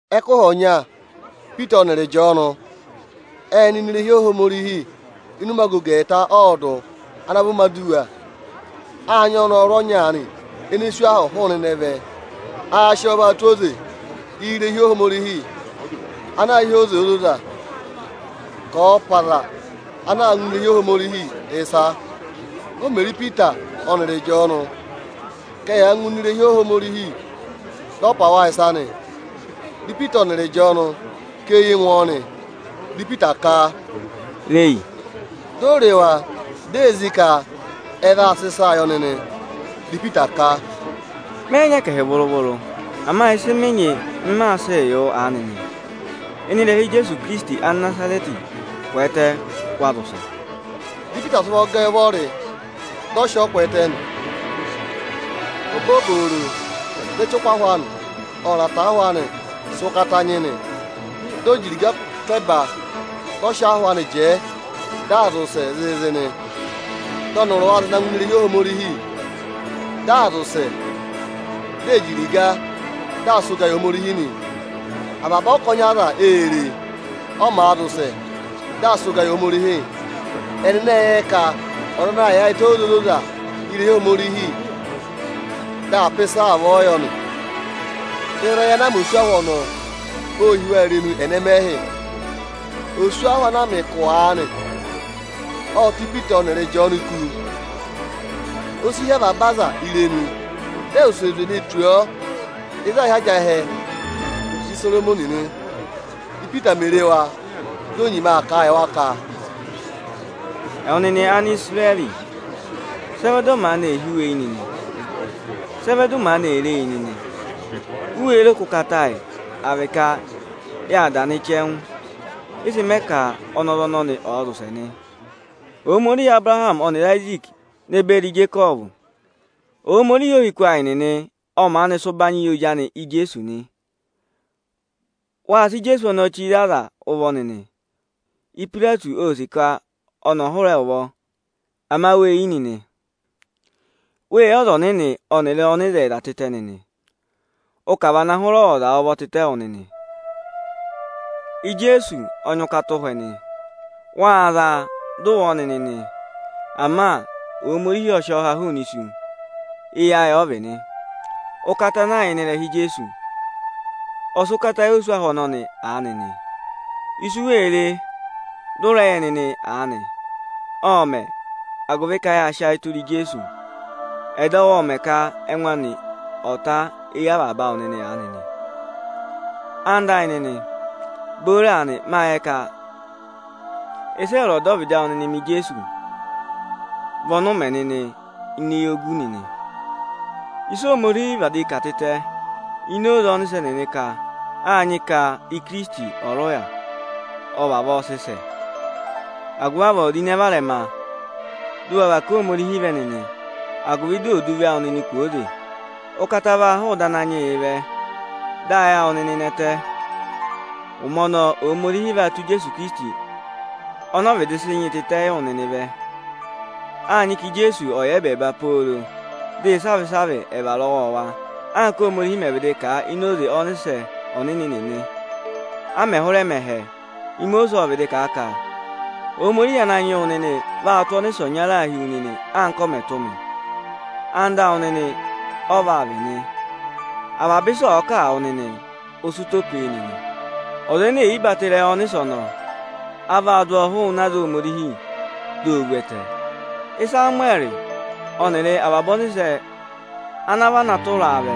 Ẹkụhị ọnya, Ipita ọnịrị Ịjọọnụ ệ nọ ini irehi Ohomorihi ịnị ụmẹ agogo ẹẹta ọọdụ ana vị ụmẹ aduwa. Â nyị ọnọrụ ọnya aanị ene sú ahụ hụụnị ịnẹ vẹ. Aā sị ọọ vaa tụ́ oze irehi Ohomorihi ana aā hị́ “Oze Ozoza” ka ọ̀ọ pà aza ana àa ngụ ini irehi Ohomorihi ịsa. O mè re Ipita ọnịrị Ịjọọnụ ka ẹyaa ngụ ini irehi Ohomorihi, dị ọ pà wa ịsa nị. Dị Ipita ọnịrị Ịjọọnụ kà eyi ngụ ọọ nị, dị Ipita ka, “Re yi!” Di o re wa, di ee zí ka ẹ vaa sị ịsaa yị ọnị nị. Dị Ipita ka, “Mẹ yị nyị ẹkẹhị vụrụ-vụrụ, ama ịsị mị nyị, m maa sịị yị wụ aanị nị: Ịnị ịrẹha Ijeesu Ikirisiti Anịnazarẹtị, kwẹẹtẹ, waa zị ụsẹ!” Dị Ipita sị ụvọ gẹ ẹ ụvọrị, dị ọ sị ọọ kwẹẹtẹ nị. Obooboro, dị ẹchụkụ ahụ anị ọnịrị ataahụ anị sị ụkata nyị nị. Di o ji iriga tụ́ ẹba, dị ọ sị ahụ anị jẹẹ, dị aa zị ụsẹẹ zịịzị nị. Dị ọnịrị wa zị ngụ ini irehi Ohomorihi, dị aa zị ụsẹ, di ee ji iriga, dị aa sị ụgaa yị Ohomorihi nị. Avaba ọkọnị aza ê re e, ọ màa zị ụsẹ, dị aa sị ụgaa yị Ohomorihi. Ẹnịnị ệ yẹ ẹ ka ọza anaā yaayịtẹ Oze Ozoza irehi Ohomorihi, dị aa pà ịsa avọọ yọ nị. Ịsa ana mẹ tù oswahụ ọnọọ, ô hí wa irenu ẹnẹmẹhị. Oswahụ ana a mẹ ụkụ aanị, ộ ta Ipita ọnịrị Ịjọọnụ kú. O si hí avaba aza irenu, dị ẹ wụsẹ zwe ne tù ọọ ịzị aā hị́ ajẹhẹ Isoromọnị nị. Ípita mè re wa, di o nyima aa kà a yị wa ka, “Ẹwụ nịnị Anisirẹrị, sị ẹ vẹ dị ọ maanị ee hí wu eyi nịnị? Sị ẹ vẹ dị ụ maanị ee re yi nịnị? U wéé ro ka ụkata ayị, à vị ka yâ da nị chẹngụ, ị sị mẹ ka ọnọrụ ọnọnị ọ̀ọ zị ụsẹ nị? Ohomorihi Abụrahamị ọnịrị Ayiziiki ne beri Ijekọvụ, Ohomorihi ohiku ayị nịnị ọ maanị sị ụbanyị yị ozi anị Ijeesu nị. Wâ sị Ijeesu ọnọọ chire aza ụvọ nịnị; Ipayireti ô sì ka ọnị ọ̀ hụrẹ ẹ ụvọ, ama wê yi nịnị. Wê yi Ọza Ọnịnị ọnịrị Ọnịzẹyịza tịtẹ nịnị, ụ ka à vana hụrẹ ọwọza ụvọ tịtẹ wụ nịnị. Ijeesu ọ nyị ụkata ụhwẹ nị; wâ za a, dị ụ wụ ọ nịnị nị. Ama Ohomorihi ọ sị ọ ha hụụnị isu, eyi ayị ọ vị nị. Ụkata ana yà ịnị ịrẹha Ijeesu, ọ sị ụkata yị oswahụ ọnọnị aanị nị. Ịsị u wee re, dị ụ rẹ yẹ nịnị aanị, ộ mẹ̀, agụvị ka yâ sị ayị tụra Ijeesu. Ẹdọwụ ọ mẹ ka ẹngụ anị ọ̀ ta éyi avaba awụ nịnị aanị nị. “Ẹwụ nịnị ẹyịnyara amị, booro aanị, mâ yẹ ka ịsị ẹwụrị ọdọvịdị nịnị mẹ Ijeesu, vị ọnị ụ mẹ nịnị ini eyogu. Ịsị Ohomorihi vịdị kà tịtẹ ini oze ọnịsẹ nịnị ka â nyị ka Ikirisiti ọ̀ rị ụya, ọ vavọọ sị sẹ nị. Agụvị avọọ ro ịnẹ varẹma, dị ụ wa và ká Ohomorihi vẹ nịnị, agụvị ò du ịvị awụ nịnị kwooze! Ụkata vaa hụụ ịdị Ananyị yịị vẹ, dị ayị awụ nịnị nẹtẹ. Ụmẹ ọnọọ, Ohomorihi vaa tụ́ Ijeesu Ikirisiti, ọnị ọ vịdị sị nyị tịtẹ yị wụ nịnịị vẹ. Â nyị ka Ijeesu ọ̀ yà ẹbẹẹba pooro dị ịsavị-ịsavị ẹ̀ vara ọwọọwa, anka Óhomorihi mẹ̀ vịdị kà a ini oze ọnịsẹ ọnịnị nịnị, a mẹ̀ hụrẹ mẹ ẹhẹ. Imosiisi ộ vịdị kà a ka: ‘Ananyị yị Ohomorihi awụ nịnị vaa tụ́ ọnịsẹ ọnyaa hi wu nịnị, anka ọ mẹ̀ tụ́ mị, anda awụ nịnị ọ vaa vị nị. Avaba ịsị ọ̀ọ kà wụ nịnị, ụ sị ụtọ pe e nịnị. Ọza ẹnẹ ẹ̀ yị batọ ịrẹyị ọnịsẹ ọnọọ, a vaa dụ ọ hụụnị aza Ohomorihi, di o vu ẹtẹ.’ Ịsamụwẹrị ọnịrị avaba ọnịsẹ ana vana tụra a vẹ,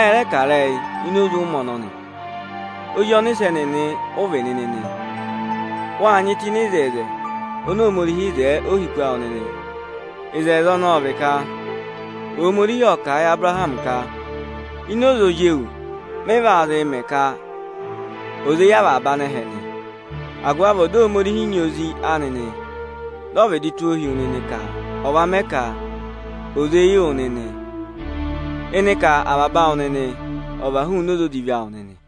ẹ rẹ kà ịrẹyị ini oze ụmẹ ọnọnị. Ozi ọnịsẹ nịnị ụ vị nịnị nị. Wâ nyị tụ́ ịnị oto oni Ohomorihi wo yi ohiku awụ nịnị. Oto ọnọọ ọ vị ka Ohomorihi ộ kà a yị Abụrahamị ka: ‘Ini oze ozi ewu mị vaa zịị mẹ ka ò zé yị avaba anẹhẹ nị.’ Agụvị avọọ dị Ohomorihi nyị Ozi anị nị, dị ọ vịdị tụ́ ọ hi wu nịnị ka ọ̀ va mẹ ka ò zé yị wụ nịnị, ịnị ka avaba awụ nịnị ọ̀ và hụụnị oze odivi awụ nịnị.”